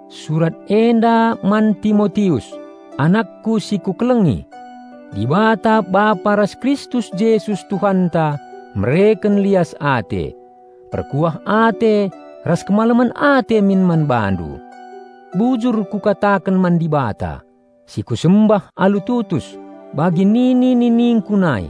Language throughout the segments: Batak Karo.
Surat enda man Timotius, anakku si kukelengi. Dibata Bapa ras Kristus Jesus Tuhanta mereken lias ate, perkuah ate ras kemalemen ate min man bandu. Bujur kukataken man Dibata, si kusembah alu tutus, bagi nini-niningku nai.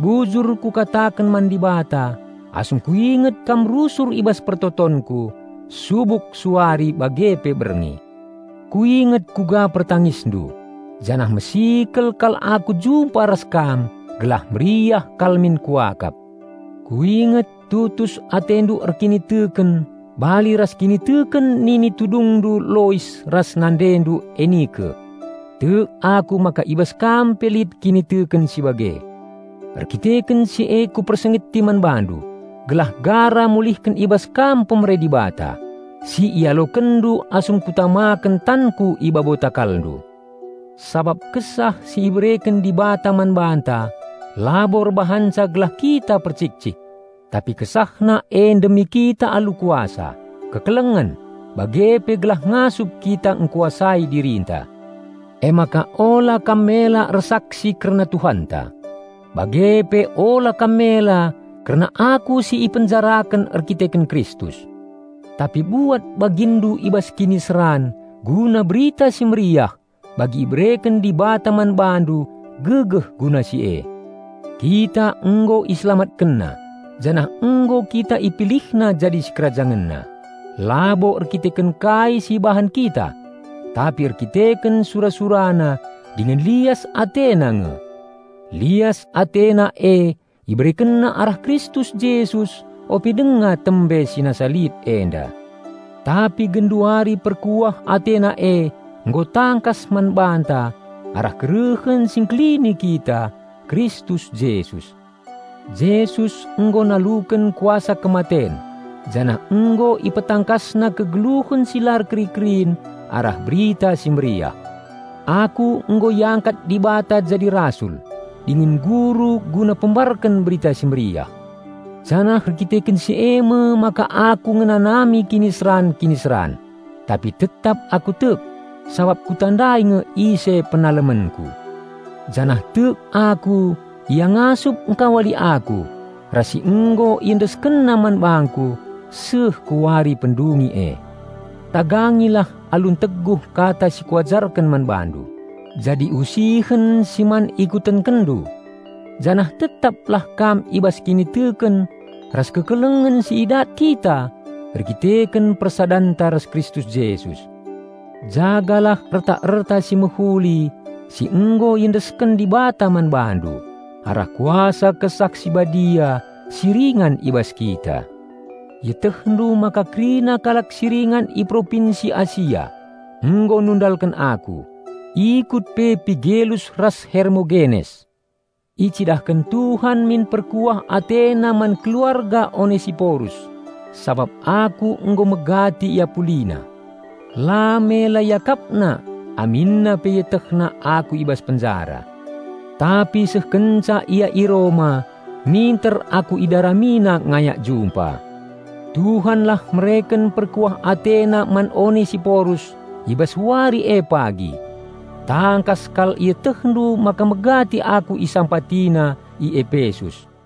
Bujur kukataken man Dibata asum kuinget kam rusur i bas pertotonku subuk suari bage pe berngi. Kuinget kuga pertangisndu, janah mesikel kal aku jumpa ras kam gelah meriah kal min kuakap. Kuinget tutus atendu erkiniteken bali ras kiniteken nini tudungndu Lois ras nandendu Enike. Tek aku maka i bas kam pe lit kiniteken si bage. Erdandanken si e kupersingeti man bandu gelah gara mulihken i bas kam pemere Dibata, si ialokenndu asum kutamaken tanku i babo takalndu. Sabap Kesah si ibereken Dibata man banta labo erbahanca gelah kita percik-cik; tapi KesahNa e ndemi kita alu kuasa, kekelengen, bage pe gelah ngasup kita ngkuasai dirinta. Emaka ula kam mela ersaksi kerna Tuhanta; bage pe ula kam mela kerna aku si ipenjaraken erdandanken Kristus. Tapi buat baginndu i bas kiniseran guna Berita Si Mehuli bagi ibereken Dibata man bandu gegeh guna si e. Kita nggo IselamatkenNa janah nggo kita IpilihNa jadi SikerajangenNa, labo erdandanken kai si ibahan kita, tapi erdandanken sura-SuraNa dingen lias AteNa nge. Lias AteNa e IberekenNa arah Kristus Jesus ope denga tembe si nasa lit enda. Tapi genduari perkuah AteNa e nggo tangkas man banta arah kerehen Si Ngkelini kita, Kristus Jesus. Jesus nggo naluken kuasa kematen janah nggo IpetangkasNa kegeluhen si la erkeri-kerin arah Berita Si Mehuli. Aku nggo iangkat Dibata jadi rasul dingen guru guna pembarken Berita Si Mehuli. Janah erdandanken si me maka aku ngenanami kiniseran-kiniseran. Tapi tetap aku tek, sabap kutandai nge ise penalemenku. Janah tek aku Ia ngasup ngkawali aku ras si nggo IendeskenNa man bangku seh ku Wari pendungi e. Tagangilah alu nteguh kata si kuajarken man bandu, jadi usihen si man ikutenkenndu. Janah tetaplah kam i bas kiniteken ras kekelengen si idat kita erkiteken persadanta ras Kristus Jesus. Jagalah erta-erta si mehuli si nggo iendesken Dibata man bandu arah Kuasa Kesah Si Badia si ringan i bas kita. Ietehndu maka kerina kalak si ringan i Propinsi Asia nggo nundalken aku, ikut pe Pigelus ras Hermogenes. Icidahken Tuhan min perkuah AteNa man keluarga Onesiporus, sabap aku nggo megati iapulina. La mela iakapna aminna pe ietehna aku i bas penjara. Tapi seh kenca ia i Roma minter aku idaramina ngayak jumpa. Tuhanlah mereken perkuah AteNa man Onesiporus i bas Wari e pagi! Tangkas kal ietehndu maka megati aku isampatina i Epesus.